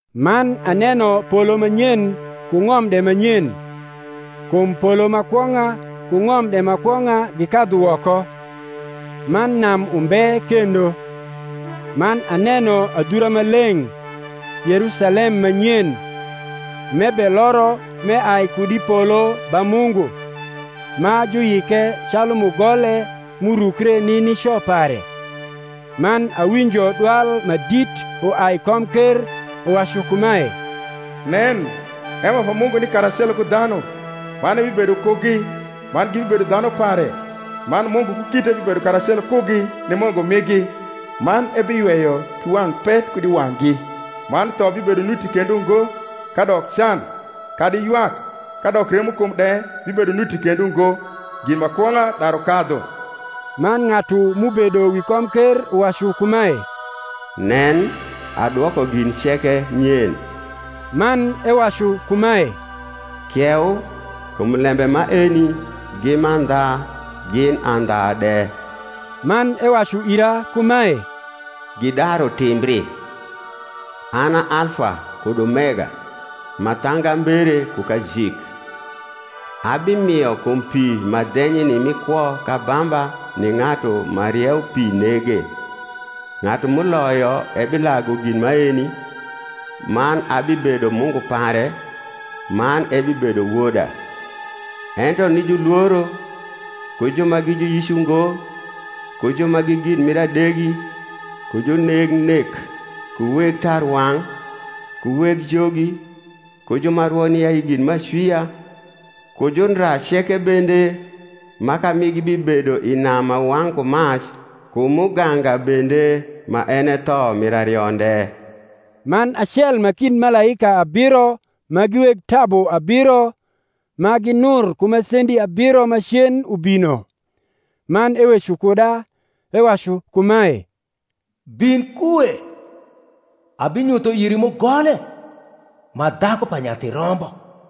Man aneno polo ma nyen ku ng’om de ma nyen: kum polo ma kwong’a ku ng’om de ma kwong’a gikadhu woko; man nam umbe kendo. Man aneno adhura ma leng’, Yerusalem ma nyen, m’ebeloro m’eai kud i polo ba Mungu, ma juyike calu mugole m’urukre ni nico pare. Man awinjo dwal ma dit uai i komker uwacu kumae, Nen, hema pa Mungu ni karacelo ku dhanu, man ebibedo kugi, man gibibedo dhanu pare man Mungu ku kite bibedo karacelo kugi, ni Mungu migi: man ebiyweyo piwang’ pet kud i wang’gi; man tho bibedo nuti kendo ngo; kadok can, kadi ywak, kadok remokum de bibedo nuti kendo ngo: gin ma kwong’a daru kadhu. Man ng’atu m’ubedo wi komker uwacu kumae, Nen, adwoko gin ceke nyen. Man ewacu kumae, Kieu: kum lembe maeni gi mandha gin andha de. Man ewacu ira kumae, Gidaru timbri. An a Alfa kud Omega, ma thangambere ku kajik. Abimio kum pi ma dhenyni mi kwo k’abamba ni ng’atu ma rieupi nege. Ng’atu m’uloyo ebilagu gin maeni; man abibedo Mungu pare, man ebibedo woda. Ento ni julworo, ku ju ma gi juyic ungo, ku ju ma gi gin mir adegi, ku juneg nek, ku weg tarwang’, ku weg jogi, ku ju ma rwo ni ayi gin m’acwia, ku jundra ceke bende, maka migi bibedo i nam ma wang’ ku mac ku muganga bende; ma en e tho mir arionde. Man acel ma kind malaika abiro ma gi weg tabu abiro, ma ginur ku masendi abiro macen ubino; man eweco kuda, ewacu kumae, Bin kue, abinyutho iri mugole, ma dhaku pa Nyathi Rombo.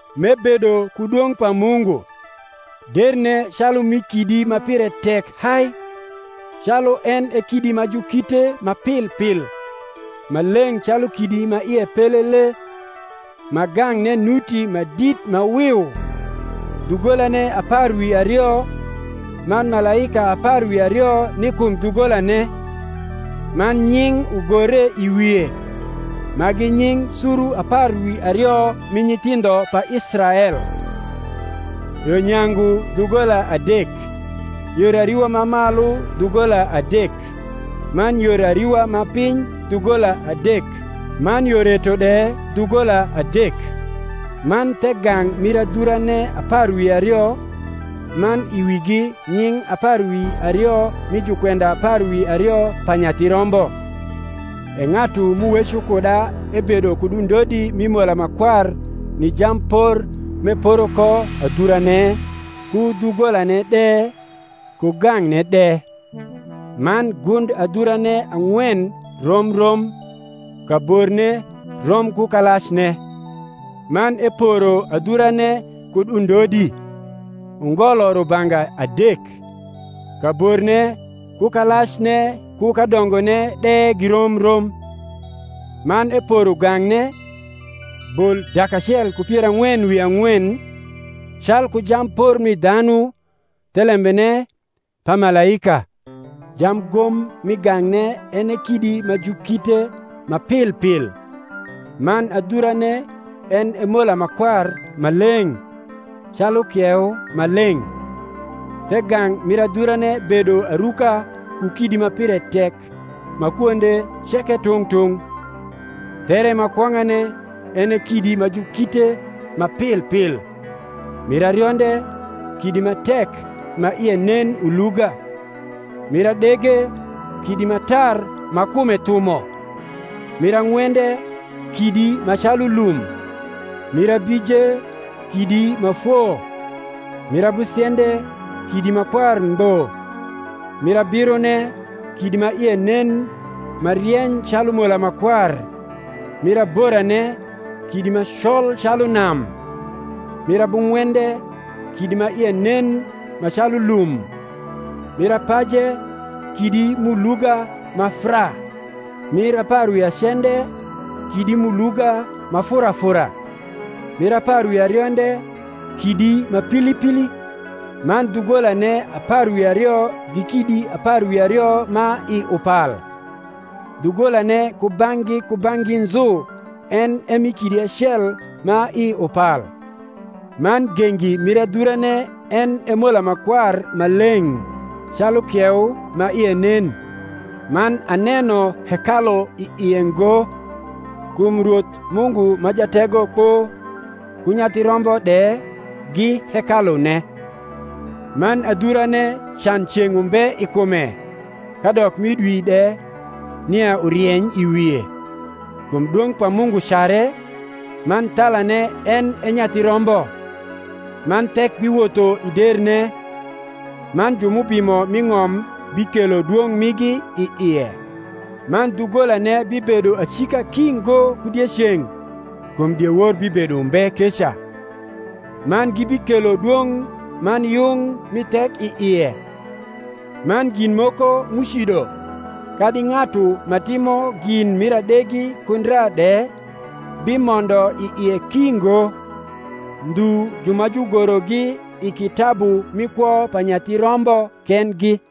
m’ebedo ku dwong’ pa Mungu: derne calu mi kidi ma pire tek hai, calu en e kidi ma jukite ma pil pil, ma leng’ calu kidi ma ie pelele: ma gang’ne nuti ma dit ma wiu; dhugolane apar wi ario, man malaika apar wi ario ni kum dhugolane; man nying’ ugore i wie, ma gi nying’ suru apar wi ario mi nyithindho pa Israel: yo nyangu dhugola adek; yor ariwa ma malu dhugola adek; man yor ariwa ma piny dhugola adek; man yo reto de dhugola adek. Man the gang’ mir adhurane apar wi ario, man i wigi nying’ apar wi ario mi jukwenda apar wi ario pa Nyathi Rombo. E ng’atu m’uweco kuda ebedo kud undodi mi mola ma kwar ni jampor m’eporo ko adhurane, ku dhugolane de, ku gang’ne de. Man gund adhurane ang’wen rom rom, kaborne rom ku kalacne: man eporo adhurane kud undodi, ungolo rubanga adek: kaborne ku kalacne ku kadongone de girom rom. Man eporo gang’ne, bol dak acel ku pier ang’wen wi ang’wen, calku jampor mi dhanu, thelembene, pa malaika. Jamgom mi gang’ne en e kidi ma jukite ma pilpil: man adhurane en e mola ma kwar ma leng’, calu kieu ma leng’. The gang’ mir adhurane bedo aruka ku kidi ma pire tek ma kwonde ceke tung’ tung’. There ma kwong’ane en e kidi ma jukite ma pil pil; mir arionde, kidi ma tek ma ie nen uluga: mir adege, kidi ma tar ma kume thumo; mir ang’wende, kidi ma calu lum; mir abije, kidi ma foo; mir abusiende, kidi ma kwar ngbo; mir abirone, kidi ma ie nen ma rieny calu mola ma kwar; mir aborane, kidi ma col calu nam; mir abung’wende, kidi ma ie nen ma calu lum; mir apaje, kidi m’uluga ma fraa; mir apar wi acende, kidi m’uluga ma furafura; mir apar wi arionde, kidi ma pilipili. Man dhugolane apar wi ario gi kidi apar wi ario ma i upal; dhugolane kubang’gi kubang’gi nzu en e mi kidi acel ma i upal: man gengi mir adhurane en e mola ma kwar ma leng’, calu kieu ma ie nen. Man aneno hekalu i ie ngo: kum Rwoth Mungu ma Jategokpo, ku Nyathi Rombo de, gi hekalune. Man adhurane can ceng’ umbe i kume, kadok mi dwi de, nia urieny i wie: kum dwong’ pa Mungu care, man thalane en e Nyathi Rombo. Man thek biwotho i derne: man ju m’ubimo m’i ng’om bikelo dwong’ migi i ie. Man dhugolane bibedo acika ki ngo ku dieceng’ (kum diewor bibedo umbe keca): man gibikelo dwong’ man yung mi thek i ie: man gin moko m’ucido, kadi ng’atu ma timo gin mir adegi ku ndra de, bimondo i ie ki ngo: ndhu ju ma jugorogi i kitabu mi kwo pa Nyathi Rombo kendgi.